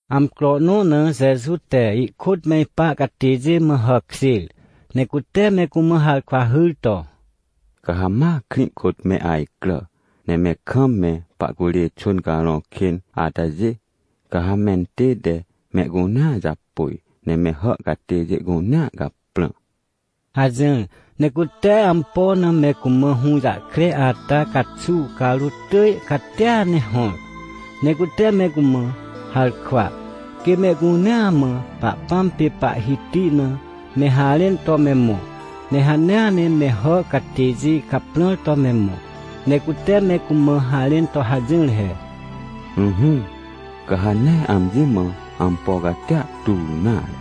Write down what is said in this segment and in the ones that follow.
Amcro nõ na Jeju te ihkôt me ipa catêjê mã hàkjêr, ne cute me cumã harkwa hyr to: ― Ca ha ma krĩ kôt me ajcrà, ne me kam me pahcurê xwỳn carõ kên atajê, ca ha mentête mehcunea japôj, ne me hà catêjê cunea caprã ― hajỹr. Ne cute ampo na me cumã hũjahkre ata caxuw carôt tỳj catia ne hõr. Ne cute me cumã harkwa, quê mehcunea mã Pahpãm pê Pahhiti na me harẽn to me mõ, ne hanea ne me hà catêjê caprãr to me mõ. Ne cute me cumã harẽn to hajỹr he: ― Ỹhỹ, ca ha nee amji mã ampo catia tur nare.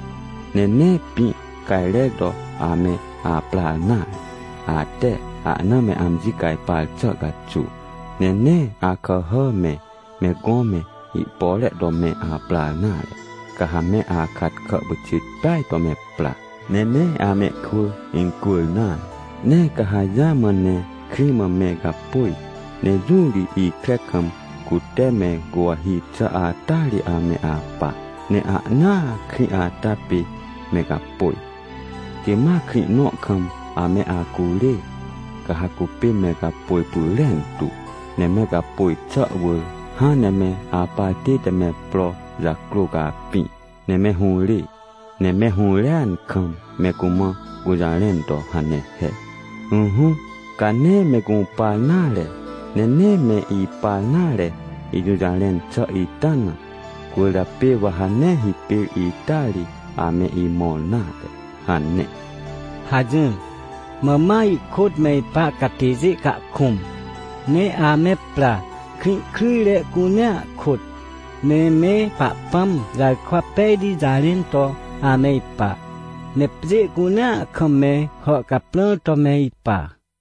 Ne nee pĩ cajrer to ame aprar nare, ate ahna me amji cajpar xà caxuw. Ne nee akàhà me, me gõ me, ihpore to me aprar nare. Ca ha me akatkà pyxit peaj to me pra, ne nee amehkwỳ incwỳr nare. Ne ca ha jamã ne krĩ mã me gapôj, ne jũ ri ikre kam, cute me guwahi xà ata ri ame apa, ne ahnaa krĩ ata pê me gapôj. Quê ma krĩ nõ kam ame acurê, ca ha cupê me gapôj pyrentu. Ne me gapôj xà wỳr hãn ne me apar tête me pro jacrô capĩ, ne me hũrê. Ne me hũrêan kam me cumã gũjarẽn to hane he: “Ỹhỹ, ca nee me gũpar nare, ne nee me ipar nare ijũjarẽn xà ita na, cwỳrjapê wa ha nee hipêr ita ri ame imõr nare!” hane ― hajỹr. Mã ma ihkôt me ipa catêjê cahkũm, ne ame pra, krĩ kryjre cunea kôt, ne me Pahpãm jarkwa pejti jarẽn to ame ipa. Ne pjê cunea kam me hà caprãr to me ipa.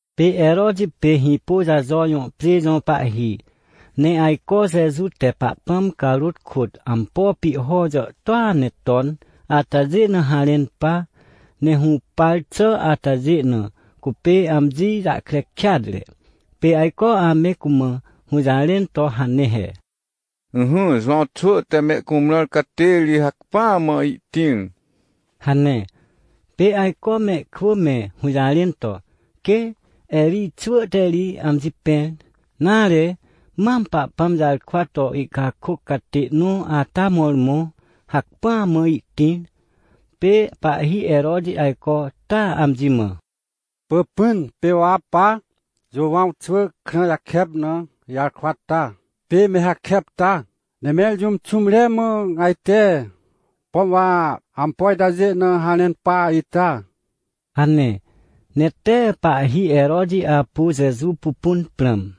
Pê Heroti pê Hĩpôjajo jõ pjê jõ pahhi, ne ajco Jeju te Pahpãm carôt kôt ampo pihho jàhtôa ne ton atajê na harẽn pa. Ne hũpar xà atajê na, cupê amji jahkre kêatre. Pê ajco ame cumã hũjarẽn to hane he: ― Ỹhỹ, Jowãw xwỳ te me cumrãr catê ri hacpỹa mã ihtĩr ― hane. Pê ajco mehkwỳ me hũjarẽn to, quê Erij xwỳ te ri amji pẽr, nare, mam Pahpãm jarkwa to ihcakôc catê nõ ata mõrmõ hacpỹa mã ihtĩr. Pê pahhi Heroti ajco taa amji mã: ― Pỳpỹn, pê wa pa Jowãw xwỳ krã jakep na ijarkwa ta, pê me hakep ta? Ne mẽr jũm xũmre mã ajte? Pom wa ampo itajê na harẽn pa ita? ― hane. Ne tee pahhi Heroti apu Jeju pupun prãm.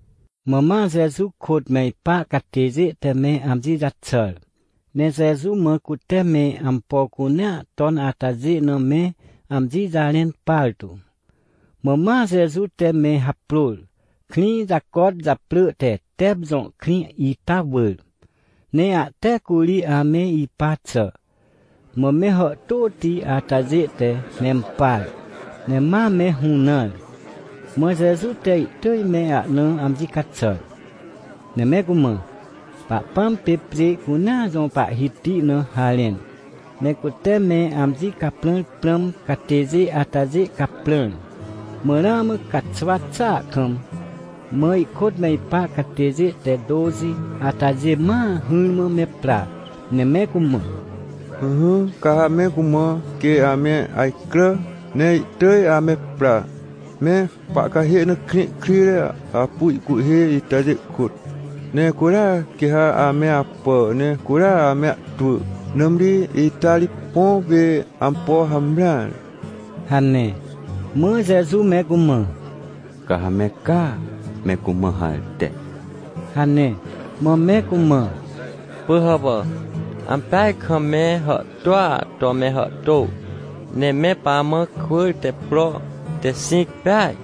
Mã ma Jeju kôt me ipa catêjê te me amji jaxàr, ne Jeju mã cute me ampo cunea ton atajê na me amji jarẽn partu. Mã ma Jeju te me haprôr, krĩ jacot japrỳ te Tep jõ krĩ ita wỳr, ne ahte curi ame ipa xà. Mã me hàhtôti atajê te mempar, ne ma me hũnãr. Mã Jeju te ihtỳj me ahna amji caxàr, ne me cumã Pahpãm pê pjê cunea jõ Pahhiti na harẽn, ne cute me amji caprãr prãm catêjê atajê caprãr. Mã ramã caxwa xàa kam, mã ihkôt me ipa catêjê te tôxi atajê ma hỹrmã me pra, ne me cumã: ― Ỹhỹ, ca ha me cumã quê ame ajcrà ne ihtỳj ame pra, me pahcahê na krĩ kryjre apu ihcuhhê itajê kôt, ne curia quê ha ame apà, ne curia ame ahtwỳ, nãmri ita ri põ pê ampo hamreare ― hane. Mã Jeju me cumã: ― Ca ha me caa me cumã harte ― hane. Mã me cumã: ― Pỳhàpà, ampeaj kam me hàhtôa to me hàhtô, ne me pamã kwỳr te pro te xĩc peaj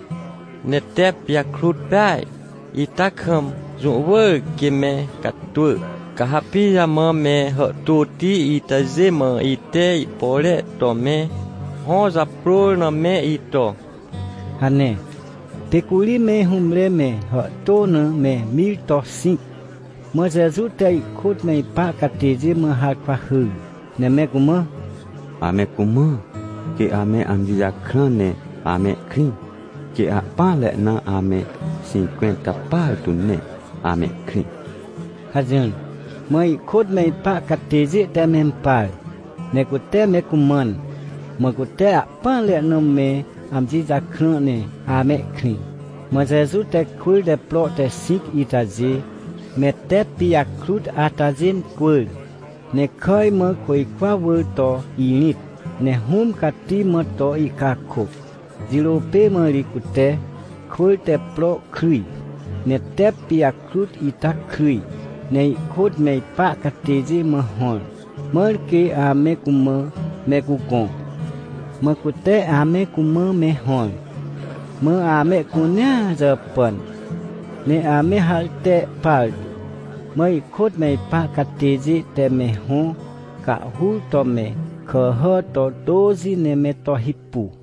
ne tep pijakrut peaj ita kam, jũ wỳr quê me catwỳ. Ca ha pijamã me hàhtôti itajê mã ite ihpore to me hõ japrôr na me ito? ― hane. Pê curi me hũmre me hàhtô na me mir to xĩc, mã Jeju te ihkôt me ipa catêjê mã harkwa hyr, ne me cumã: ― Ame cumã, quê ame amji jakrã ne amehkrĩ. Quê ahpỹanre na ame xĩncwẽnta partu ne amehkrĩ ― hajỹr. Mã ihkôt me ipa catêjê te mempar, ne cute me cumãn, mã cute ahpỹanre na me amji jakrã ne amehkrĩ. Mã Jeju te kwỳr te pro te xĩc itajê, me tep pijakrut atajê incwỳr, ne kàj mã côjkwa wỳr to irĩt, ne Hũm Cati mã to ihcakôc. Jirô pê mã ri cute kwỳr te pro kryj, ne tep pijakrut ita kryj, ne ihkôt me ipa catêjê mã hõr, mãr quê ame cumã me cugõ. Mã cute ame cumã me hõr. Mã amehcunea jàpàn, ne ame harte partu. Mã ihkôt me ipa catêjê te me hõ cahhur to me kàhà to tôxi ne me to hipu.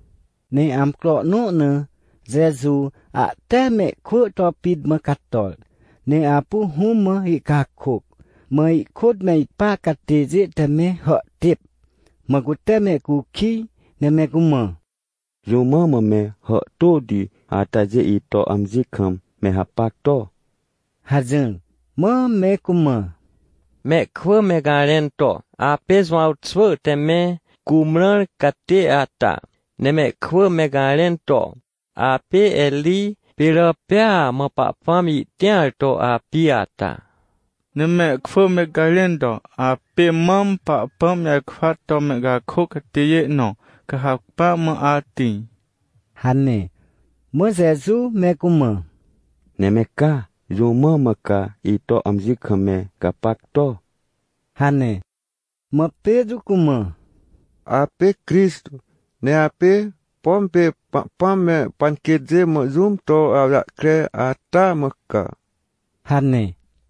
Ne amcro nõ na Jeju ahte mehkwỳ to pit mã cator, ne apu Hũm mã ihcakôc, mã ihkôt me ipa catêjê te me hàhtêp. Mã cute mehcukij, ne me cumã: ― Jũ mã mã me hàhtôti atajê ito amji kam me hapac to? ― hajỹr. Mã me cumã: ― Mehkwỳ me garẽn to, apê Jowãw xwỳ te me cumrãr catê ata, ne mehkwỳ me garẽn to, apê Erij pê rỳ pêa mã Pahpãm ihtĩar to api ata, ne mehkwỳ me garẽn to, apê mam Pahpãm jarkwa to mehcakôc catêjê nõ, ca hacpỹa mã atĩr ― hane. Mã Jeju me cumã: ― Ne me ca? Jũ mã mã ca ito amji kam me gapac to? ― hane. Mã Petrô cumã: ― Apê Crixtô, ne apê, pom pê Pahpãm me panquêtjê mã jũm to awjahkre ata mã ca ― hane.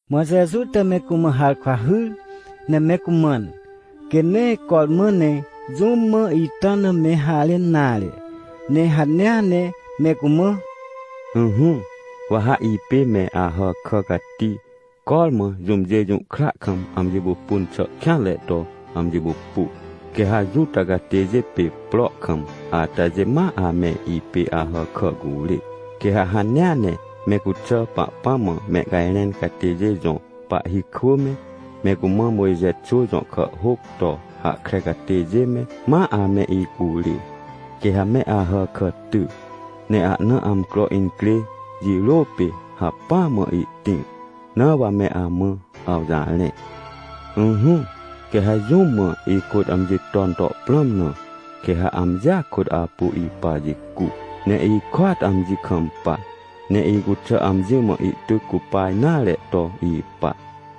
Mã Jeju te me cumã harkwa hyr, ne me cumãn, quê nee cormã ne jũm mã ita na me harẽn nare, ne hanea ne me cumã: ― Ỹhỹ, wa ha ipê me Ahàkà cati, cormã jũmjê jũhkra kam amji pupun xà kêanre to amji pupu. Quê ha Juta catêjê pê prohkam atajê ma ame ipê Ahàkà curê. Quê ha hanea ne me cuxà Pahpãm mã mehcajrẽn catêjê jõ pahhi kwỳ me, me cumã Mojxe xwỳ jõ kàhhôc to hahkre catêjê me, ma ame icurê. Quê ha me Ahàkà ty, ne ahna amcro incrê jirô pê hacpỹa mã ihtĩr. Na wa me amã awjarẽ. ― Ỹhỹ, quê ha jũm mã ikôt amji ton to prãm na, quê ha amjia kôt apu ipa jicu, ne ikôat amji kampa, ne icuxà amji mã ihtyc cupa nare to ipa.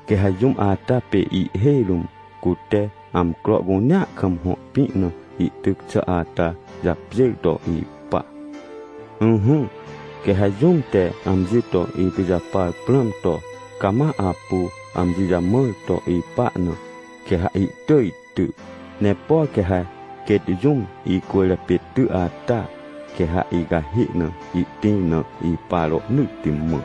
Quê ha jũm ata pê ihhêj rũm cute amcro cunea kam hõ pĩ na ihtyc xà ata japjêr to ipa. ― Ỹhỹ, quê ha jũm te amji to ipijapar prãm to, cama apu amji jamãr to ipa na, quê ha ihtỳj ty. Ne por quê ha quêt jũm icwỳrjapê ty ata, quê ha icahê na ihtĩr na ipa rohnỳtti mã.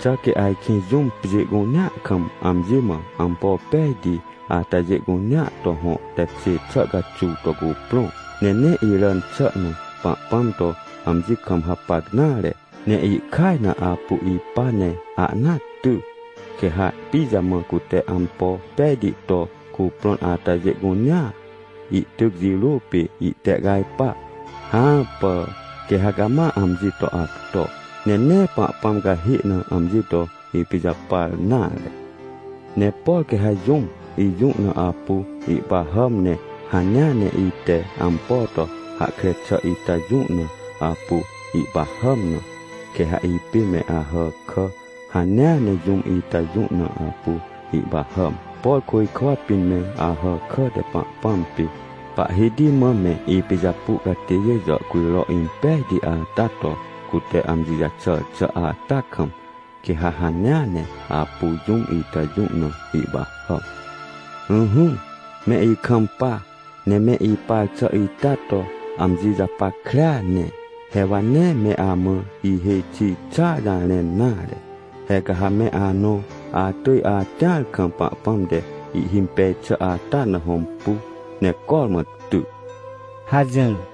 ― Xà quê ajkĩ jũm pjê cunea kam amji mã ampo pejti atajê cunea to hõ tekjê xà caxuw to cuprõ, ne nee iràn xà na Pahpãm to amji kam hapac nare, ne ihkaj na apu ipa ne ahnaa ty, quê ha pijamã cute ampo pejti to cuprõn atajê cunea, ihtyc jirô pê ihtehcajpa? Hãpà, quê ha cama amji to acto, ne nee Pahpãm cahê na amji to ipijapar nare. ― Ne por quê ha jũm ijũ na apu ihpahàm, ne hanea ne ite ampo to hahkre xà ita jũ na apu ihpahàm na, quê ha ipê me Ahàkà hanea ne jũm ita jũ na apu ihpahàm. Por côjkwa pĩn me Ahàkà te Pahpãm pê Pahhiti mã me ipijapu catêjê jàhcujro impejti ata to cute amji jaxàr xà ata kam, quê ha hanea ne apu jũm ita jũ na ihpahàm. ― Ỹhỹ, me ikampa, ne me ipar xà ita to amji japackrea ne, he wa nee me amã ihêj xi xàa jarẽn nare. He ca ha me anõ atỳj atĩar kam Pahpãm te ihhimpej xà ata na hõmpu ne cormã ty ― hajỹr.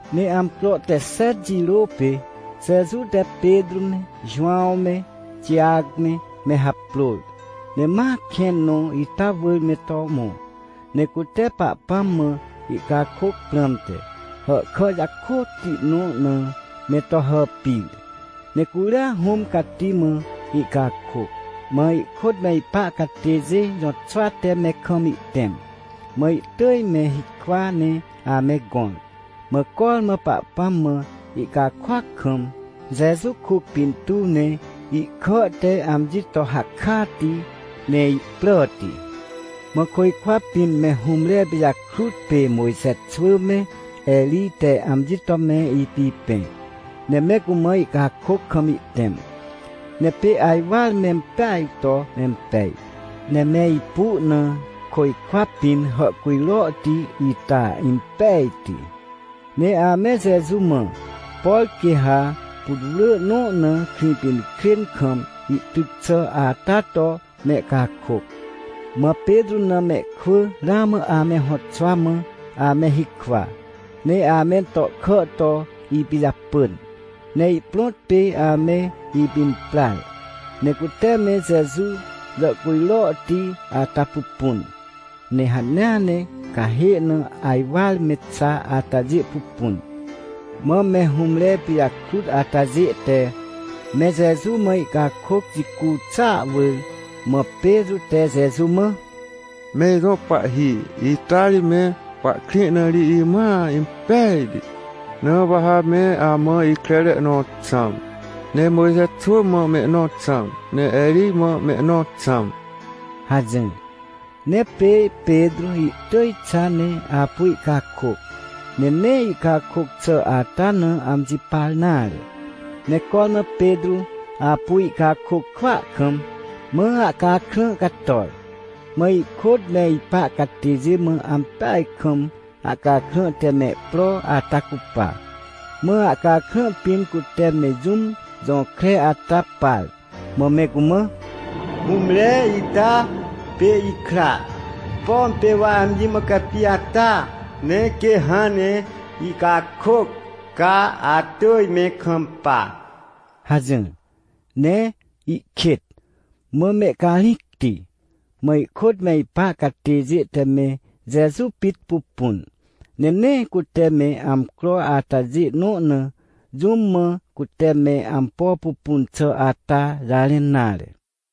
Ne amcro te xet jirô pê, Jeju te Petrô me Jowãw me Tijac me, me haprôr. Ne ma kẽn nõ ita wỳr me to mõ, ne cute Pahpãm mã ihcakôc prãmte, hàhkà jakôtti nõ na me to hàpir. Ne curia Hũm Cati mã ihcakôc, mã ihkôt me ipa catêjê jõtxwa te me kam ihtẽm, mã ihtỳj me hikwa ne ame gõr. Mã cormã Pahpãm mã ihcakôac kam, Jeju kuc pintuw ne ihkà te amji to hakati, ne ihpràti. Mã côjkwa pĩn me hũmre pijakrut pê Mojxe xwỳ me Erij te amji to me ipipẽ, ne me cumã ihcakôc kam ihtẽm. Ne pê ajwar mempeaj to mempej, ne me ipu na côjkwa pĩn hàhcujrohti ita impejti. Ne ame Jeju mã, por quê ha putwrỳ nõ na Krĩpinkrên kam ihtyc xà ata to mehcakôc. Mã Petrô na mehkwỳ ramã ame hõtxwa mã ame hikwa, ne amentohkà to ipijapỳn, ne ihprõt pê ame ipimprar, ne cute me Jeju jàhcujrohti ata pupun, ne hanea ne cahê na ajwar me xa atajê pupun. Mã me hũmre pijakrut atajê te me Jeju mã ihcakôc jicu xàa wỳr, mã Petrô te Jeju mã: ― Me ijõ Pahhi, ita ri me pahkrĩ na ri imãa impejti, na wa ha me amã ikrere nõ xãm, ne Mojxe xwỳ mã mehnõ xãm, ne Erij mã mehnõ xãm ― hajỹr. Ne pê Petrô ihtỳj xa ne apu ihcakôc, ne nee ihcakôc xà ata na amji par nare. Ne cormã Petrô apu ihcakôc kwỳa kam, mã ahcakrã cator, mã ihkôt me ipa catêjê mã ampeaj kam ahcakrã te mehpro ata cupa. Mã ahcakrã pĩn cute me jũm jõkre ata par, mã me cumã: ― Hũmre ita pê ikra. Pom pê wa amji mã capi ata. Ne quê hãn ne ihcakôc, ca atỳj me kampa ― hajỹr. Ne ihkêt, mã mehcarĩcti, mã ihkôt me ipa catêjê te me Jeju pit pupun, ne nee cute me amcro atajê nõ na, jũm mã cute me ampo pupun xà ata jarẽn nare.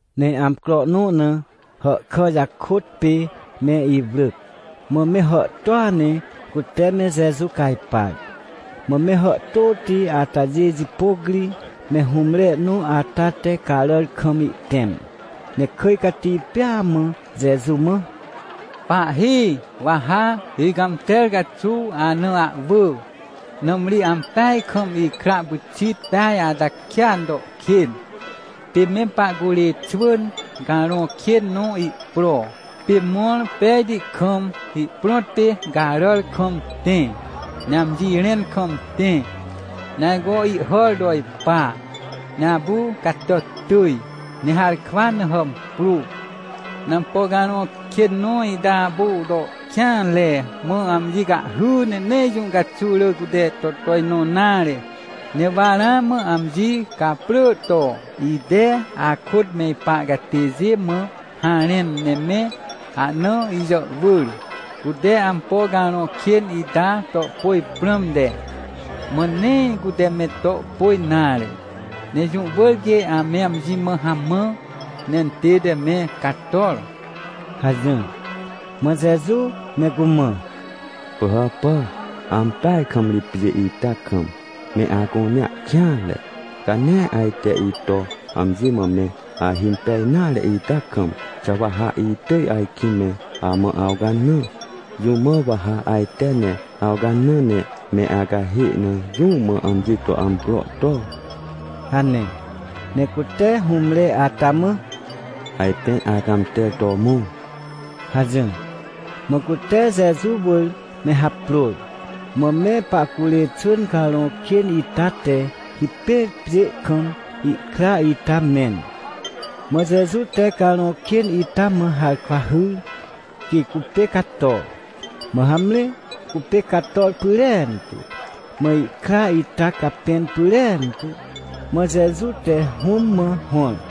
Ne amcro nõ na, hàhkà jakôt pê me iwrỳc, mã me hàhtôa ne cute me Jeju cajpar. Mã me hàhtôti atajê jipôc ri me hũmre nõ ata te caràr kam ihtẽm, ne kỳj cati pêa mã Jeju mã: ― Pahhi! Wa ha icãmter caxuw ana ahwỳ! Nãmri ampeaj kam ikra pyxit peaj ata kêan to kên. Pê me pahcurê xwỳn carõ kên nõ ihpro, pê mõr pejti kam, ihprõt pê caràr kam tẽ, ne amji rẽn kam tẽ, ne ajco ihhàr to ipa, ne apu catàt tỳj, ne harkwa na hàmprô. Ne ampo carõ kên nõ ita apu to kêanre, mã amji cahhy, ne nee jũ caxuw rỳ cute to tojnõ nare. Ne wa ramã amji caprỳ to ite akôt me ipa catêjê mã harẽn ne me ahna ijàhwỳr, cute ampo carõ kên ita to pôj prãmte, mã nee cute me to pôj nare. Ne jũ wỳr quê ame amji mã hamã, ne intête me cator ― hajỹr. Mã Jeju me cumã: ― Pỳhàpà, ampeaj kam ri pjê ita kam, me acunea kêanre. Ca nee ajte ito amji mã me ahimpej nare ita kam, xà wa ha itỳj ajkĩ me amã awcanã? Jũ mã wa ha ajte ne awcanã, ne me acahê na jũ mã amji to amcro to? ― hane. Ne cute hũmre ata mã: ― Ajpên acãmter to mõ ― hajỹr. Mã cute Jeju wỳr me haprôr, mã me pahcurê xwỳn carõ kên ita te hipêr pjê kam ihkra ita mẽn. Mã Jeju te carõ kên ita mã harkwa hyr, quê cupê cato. Mã hamre, cupê cator pyrentu, mã ihkra ita capẽn pyrentu. Mã Jeju te hũm mã hõr.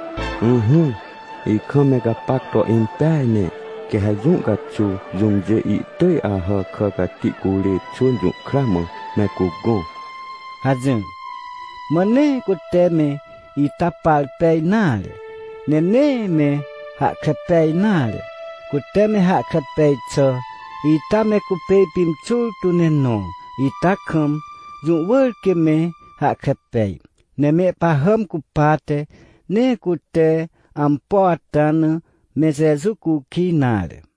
― Ỹhỹ, ikam me gapac to impeaj ne. Quê ha jũ caxuw jũmjê ihtỳj Ahàkà cati curê xwỳn jũhkra mã me cugõ ― hajỹr. Mã nee cute me ita par pej nare, ne nee me hahkre pej nare. Cute me hahkre pej xà ita me cupê ipimxur tu ne nõ ita kam, jũ wỳr quê me hahkre pej. Ne mehpahàm cupate nee cute ampo ata na me Jeju cukij nare.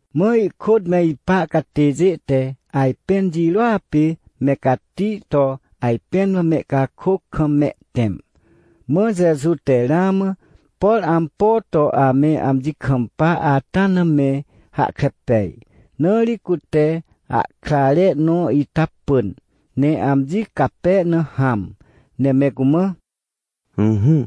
Mã ihkôt me ipa catêjê te ajpẽn jirôa pê me cati to ajpẽn mã mehcakôc kam mehtẽm. Mã Jeju te ramã, por ampo to ame amji kampa ata na me hahkre pej. Na ri cute ahkrare nõ ita pỳn, ne amji cape na hãm, ne me cumã: ― Ỹhỹ,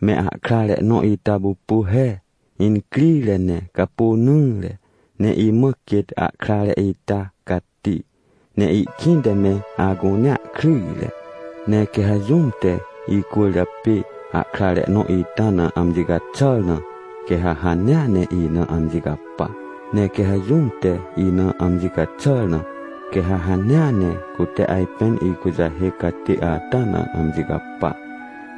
me ahkrare nõ ita pupu he, incrire ne capônỹre. Ne imã quêt ahkrare ita cati, ne ihkĩnte me acunea kryjre. Ne quê ha jũm te icwỳrjapê ahkrare nõ ita na amji caxàr na, quê ha hanea ne ina amji capa. Ne quê ha jũm te ina amji caxàr na, quê ha hanea ne cute ajpên ikujahêc catê ata na amji capa.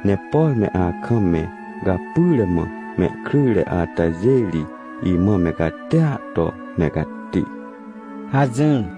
Ne por me akam me gapyre mã mehkryjre atajê ri, imã me catia to me cati ― hajỹr.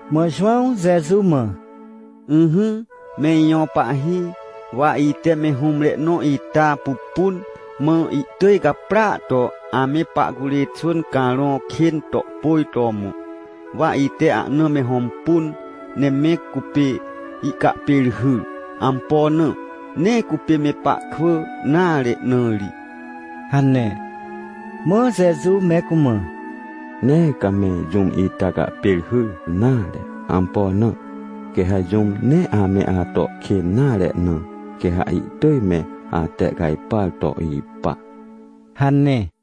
Mã Jowãw Jeju mã: ― Ỹhỹ, me ijõ Pahhi, wa ite me hũmre nõ ita pupun, mã ihtỳj gaprỳa to ame pahcurê xwỳn carõ kên to pôj to mõ. Wa ite ahna me hõmpun ne me cupê ihcahpêrhyr. Ampo na? Nee cupê me pahkwỳ nare na ri ― hane. Mã Jeju me cumã: ― Nee ca me jũm ita cahpêrhyr nare. Ampo na? Quê ha jũm nee ame ato kên nare na, quê ha ihtỳj me atehcajpar to ipa ― hane.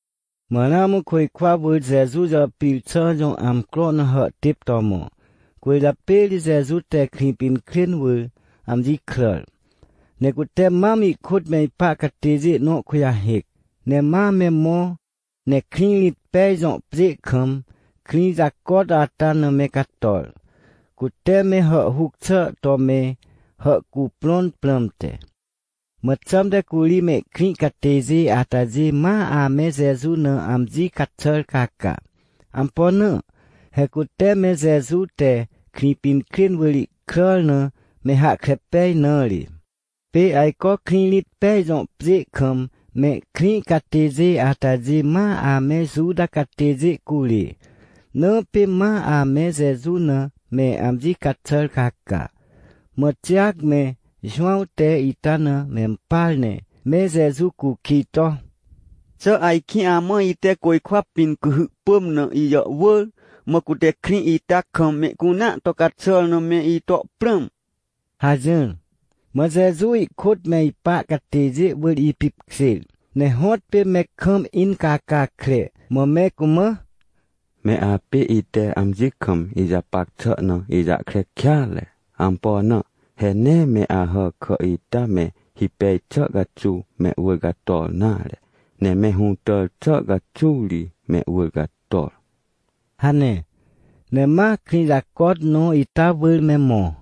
Mã ramã côjkwa wỳr Jeju jàpir xà jõ amcro na hàhtêp to mõ. Cwỳrjapê ri Jeju te Krĩpinkrên wỳr amji kràr. Ne cute mam ihkôt me ipa catêjê nõ kujahêc. Ne ma me mõ ne Krĩrĩtpej jõ pjê kam, krĩ jacot ata na me cator, cute me hàhhuc xà to me hàhcuprõn prãmte. Mã xãmte curi mehkrĩ catêjê atajê ma ame Jeju na amji caxàr caca. Ampo na? He cute me Jeju te Krĩpinkrên wỳr ihkràr na me hahkre pej na ri. Pê ajco Krĩrĩtpej jõ pjê kam mehkrĩ catêjê atajê ma ame Juta catêjê curê, na pê ma ame Jeju na me amji caxàr caca. Mã Tijac me Jowãw te ita na mempar, ne me Jeju cukij to: ― Xà ajkĩ amã ite côjkwa pĩn cuhy pỳm na ijàhwỳr, mã cute krĩ ita kam mehcunea to caxàr na me ito prãm? ― hajỹr. Mã Jeju ihkôt me ipa catêjê wỳr ipipkjêr, ne hõtpê me kam incàcàcre, mã me cumã: ― Me apê ite amji kam ijapac xà na ijahkre kêatre. Ampo na? He nee me Ahàkà ita me hipej xà caxuw mehwỳr cator nare, ne me hũtàr xà caxuw ri mehwỳr cator ― hane. Ne ma krĩ jacot nõ ita wỳr me mõ.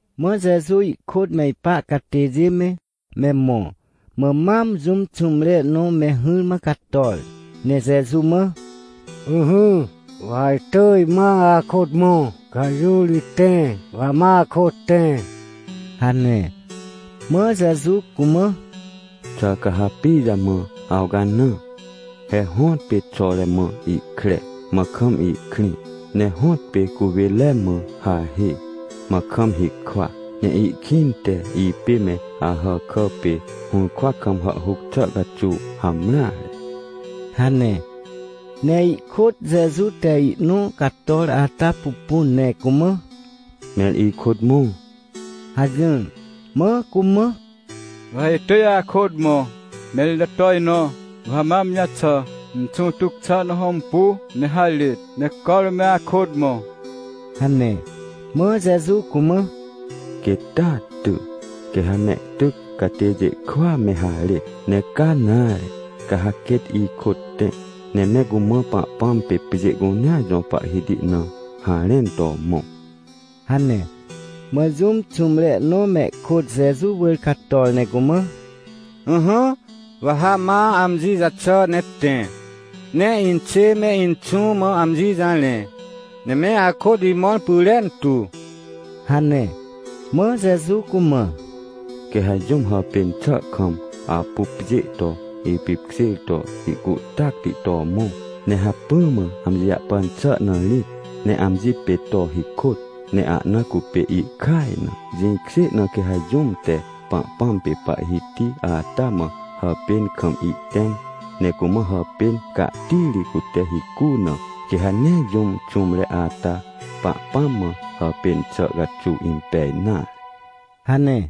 Mã Jeju ihkôt me ipa catêjê me, me mõ, mã mam jũm xũmre nõ me hỹrmã cator, ne Jeju mã: ― Ỹhỹ, wa ha itỳj ma akôt mõ, ca ha jũ ri tẽ, wa ha ma akôt tẽ ― hane. Mã Jeju cumã: ― Xà ca ha pijamã awcanã? He hõtpê xore mã ihkre, mã kam ihkrĩ, ne hõtpê cuwênre mã hahê, mã kam hikwa, ne ihkĩnte ipê me Ahàkà pê hũrkwa kam hàhhuc xà caxuw hamreare ― hane. Ne ihkôt Jeju te ihnõ cator ata pupun ne cumã: ― Mẽr ikôt mõ ― hajỹr. Mã cumã: ― Wa ha itỳj akôt mõ, mẽr ito tojnõ wa ha ma amji jaxà, ne inxũ tyc xà na hõmpu ne harêt, ne cormã me akôt mõ ― hane. Mã Jeju cumã: ― Quêt taa ty, quê ha mehtyc catêjê kwỳa me harêt. Ne ca nare, ca ha quêt ikôt tẽ, ne me cumã Pahpãm pê pjê cunea jõ Pahhiti na harẽn to mõ ― hane. Mã jũm xũmre nõ mehkôt Jeju wỳr cator ne cumã: ― Ỹhỹ, wa ha ma amji jaxà ne tẽ, ne inxê me inxũ mã amji jarẽ, ne me akôt imõr pyrentu ― hane. Mã Jeju cumã: ― Quê ha jũm hàpên xà kam apu pjê to ipipkjêr to ihcuhtacti to mõ, ne hacpỹ mã amji jahpan xà rĩt, ne amji pê to hikôt, ne ahna cupê ihkaj na. Jĩkjê na quê ha jũm te Pahpãm pê Pahhiti ata mã hàpên kam ihtẽm, ne cumã hàpên cahtiri cute hicu na, quê ha nee jũm xũmre ata Pahpãm mã hàpên xà caxuw impej nare ― hane.